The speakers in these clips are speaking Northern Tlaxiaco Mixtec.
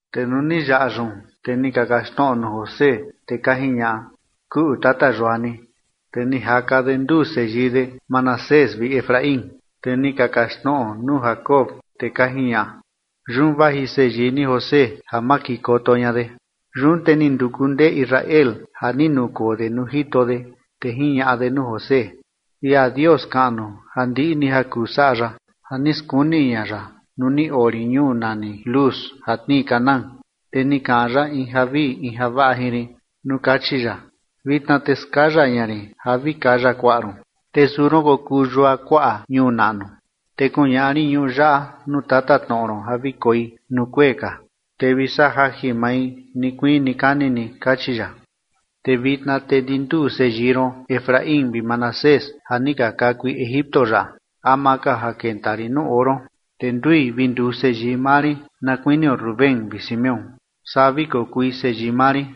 Te nuu ni yaꞌa yun, te ni ka kaxtnoꞌo nuu José, te ka jiñaꞌa: ―Kuꞌu tata yua ni. Te ni jaka de nduu seyii de, Manasés vi Efraín. Te ni ka kaxtnoꞌo nuu Jacob, te ka jiñaꞌa: ―Yun vaji seyii ni José ja makikoto ña de. Yun te ni nduku ndee Israel ja ni nukoo de nuu jito de, te jiñaꞌa de nuu José: ―Ia Dios kaꞌnu, ja ndiꞌi ni ja kuu saꞌa ya, ja ni skuni ña ya nuu ni oo rin ñuu nani Luz ja tnii Canaán, te ni kaꞌan ya in javii in javaꞌa jin rin nuu kachi ya: “Vitna te skaya ña rin ja vi kaya kuaꞌa ron, te suu ron kokuu yua kuaꞌa ñuu naꞌnu, te kuñaꞌa rin ñuꞌu yaꞌa nuu tatatnoꞌo ron ja vi koi nuu kuee ka, te vi saꞌa jajin mai nikuii nikani ni”, kachi ya. Te vitna te ndi nduu seyii ron Efraín vi Manasés ja ni ka kakui Egipto yaꞌa ama ka ja kenta rin nuu oo ron, te ndui vi nduu seyii maa rin, na kuinio Rubén vi Simeón, saa vi kokui seyii maa rin.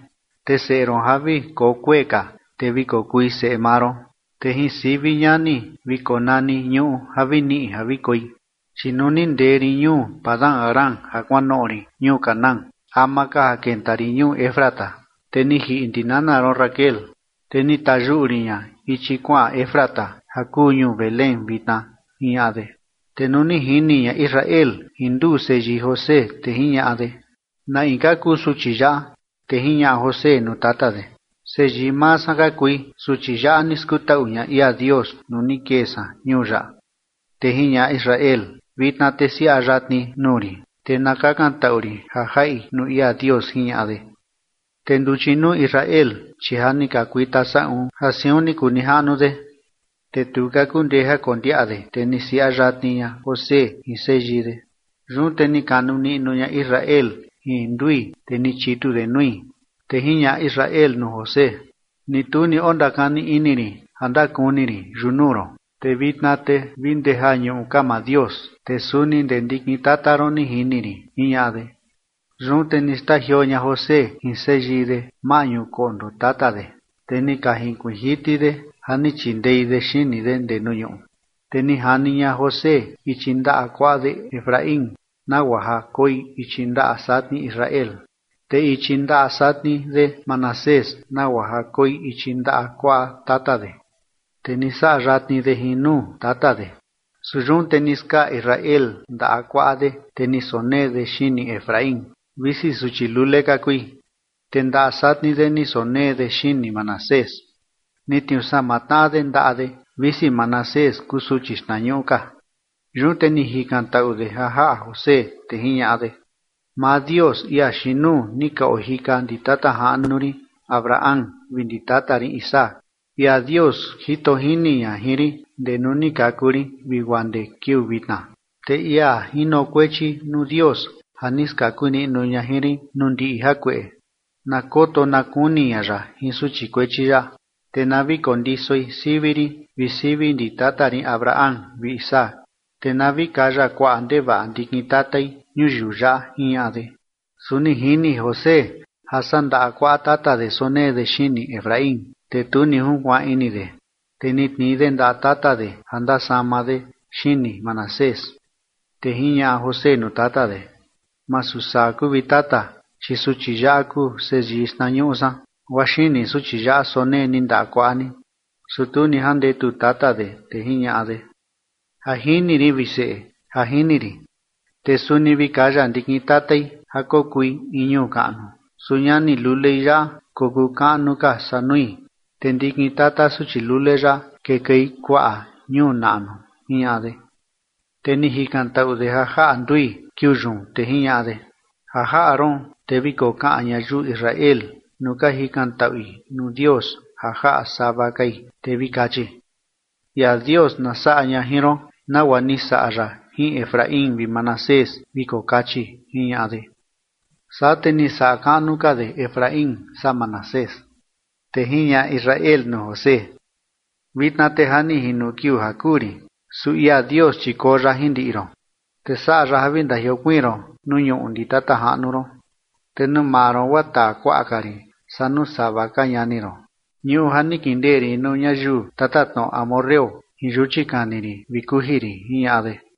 Te seꞌe ron ja vi koo kuee ka, te vi kokui seꞌe maa ron, te jin sivi ñani vi konani ñuꞌu ja vi niꞌi ja vi koi. Chi nuu ni ndee rin ñuu Padan-aram ja kuanoꞌo rin ñuu Canaán, ama ka ja kenta rin ñuu Efrata, te ni jiꞌi ndi nana ron Raquel, te ni tayuꞌu rin ña ichi kuaꞌan Efrata, ja kuu ñuu Belén vitna ―jiñaꞌa de. Te nuu ni jini ña Israel jin nduu seyii José, te jiñaꞌa de: ―¿Na in ka kuu suchi yaꞌa? Te jiñaꞌa José nuu tata de: ―Seyii maa san ka kui, suchi yaꞌa ni skutaꞌu ña ia Dios nuu ni kee san ñuu yaꞌa. Te jiñaꞌa Israel: ―Vitna te siaꞌa yatni nuu rin, te na kakantaꞌu rin ja jaꞌi nuu ia Dios ―jiñaꞌa de. Te nduchi nuu Israel, chi ja ni ka kuita saꞌun ja siun ni kuu nijaꞌnu de, te tu ka kundee ja kondiaꞌa de, te ni siaꞌa yatni ña José jin seyii de. Yun te ni kanu niꞌnu ña Israel jin ndui, te ni chitu de nui. Te jiñaꞌa Israel nuu José: ―Ni tu ni ondakani ini rin ja ndakuni rin yunuu ron, te vitna te vi ndee ja ñuꞌu ka maa Dios, te suni ndee ndikin tata ron ni jini rin ―jiñaꞌa de. Yun te ni xtajioo ña José jin seyii de maꞌñu koꞌndo tata de, te ni ka jinkuiin jiti de ja ni chindei de xini de ndee nuu ñuꞌu. Te ni jani ña José ichi ndaꞌa kuaꞌa de Efraín, nagua ja koi ichi ndaꞌa satni Israel, te ichi ndaꞌa satni de Manasés nagua ja koi ichi ndaꞌa kuaꞌa tata de, te ni saꞌa yatni de jin nuu tata de. Su yun te ni skaa Israel ndaꞌa kuaꞌa de, te ni sonee de xini Efraín, visi suchi lule ka kui, te ndaꞌa satni de ni sonee de xini Manasés. Ni tniuu sama tnaꞌa de ndaꞌa de, visi Manasés kuu suchi xtnañuꞌu ka. Yun te ni jikantaꞌu de ja jaꞌa José, te jiñaꞌa de: ―Maa Dios ia xiin nuu ni ka ojika ndi tata jaꞌnu rin Abraham vi ndi tata rin Isaac, ia Dios jito jini ña jin rin ndee nuu ni kaku rin vi guaa ndee kiuu vitna, te ia jinokuechi nuu Dios ja ni skaku niꞌnu ña jin rin nuu ndiꞌi jakueꞌe, na koto na kuni ña ya jin suchi kuechi yaꞌa, te na vi kondisoi sivi rin vi sivi ndi tata rin Abraham vi Isaac, te na vi kaya kuaꞌa ndevaꞌa ndikin tatai ñuyiu yaꞌa ―jiñaꞌa de. Su ni jini José ja saa ndaꞌa kuaꞌa tata de sonee de xini Efraín, te tu ni junkuaan ini de, te ni tnii de ndaꞌa tata de ja ndasama de xini Manasés. Te jiñaꞌa José nuu tata de: ―Masu saa kuu, vi tata, chi suchi yaꞌa kuu seyii xtnañuꞌu san, guaa xini suchi yaꞌa sonee ni ndaꞌa kuaꞌa ni. Su tu ni jandetu tata de, te jiñaꞌa de: ―Ja jini rin, vi seꞌe, ja jini rin, te suni vi kaya ndikin tatai ja kokui in ñuu kaꞌnu, su ñani lulei yaꞌa kokuu kaꞌnu ka saa nui, te ndikin tata suchi lule yaꞌa kekuei kuaꞌa ñuu naꞌnu ―jiñaꞌa de. Te ni jikantaꞌu de ja jaꞌa ndui kiuu yun, te jiñaꞌa de: ―Ja jaꞌa ron te vi kokaꞌan ñayiu Israel nuu ka jikantaꞌui nuu Dios ja jaꞌa sava kai, te vi kachi: “Ia Dios na saꞌa ña jin ron nagua ni saꞌa ya jin Efraín vi Manasés”, vi kokachi ―jiñaꞌa de. Saa te ni saꞌa kaꞌnu ka de Efraín saa Manasés. Te jiñaꞌa Israel nuu José: ―Vitna te ja ni jino kiuu ja kuu rin, su ia Dios chi koo ya jin ndiꞌi ron, te saꞌa ya ja vi ndajiokuiin ron nuu ñuꞌu ndi tata jaꞌnu ron. Te nuu maa ron guaa taa kuaꞌa ka rin saa nuu sava ka ñani ron, ñuꞌu ja ni kindee rin nuu ñayiu tatatnoꞌo amorreo jin yuchi kani rin vi kuji rin ―jiñaꞌa de.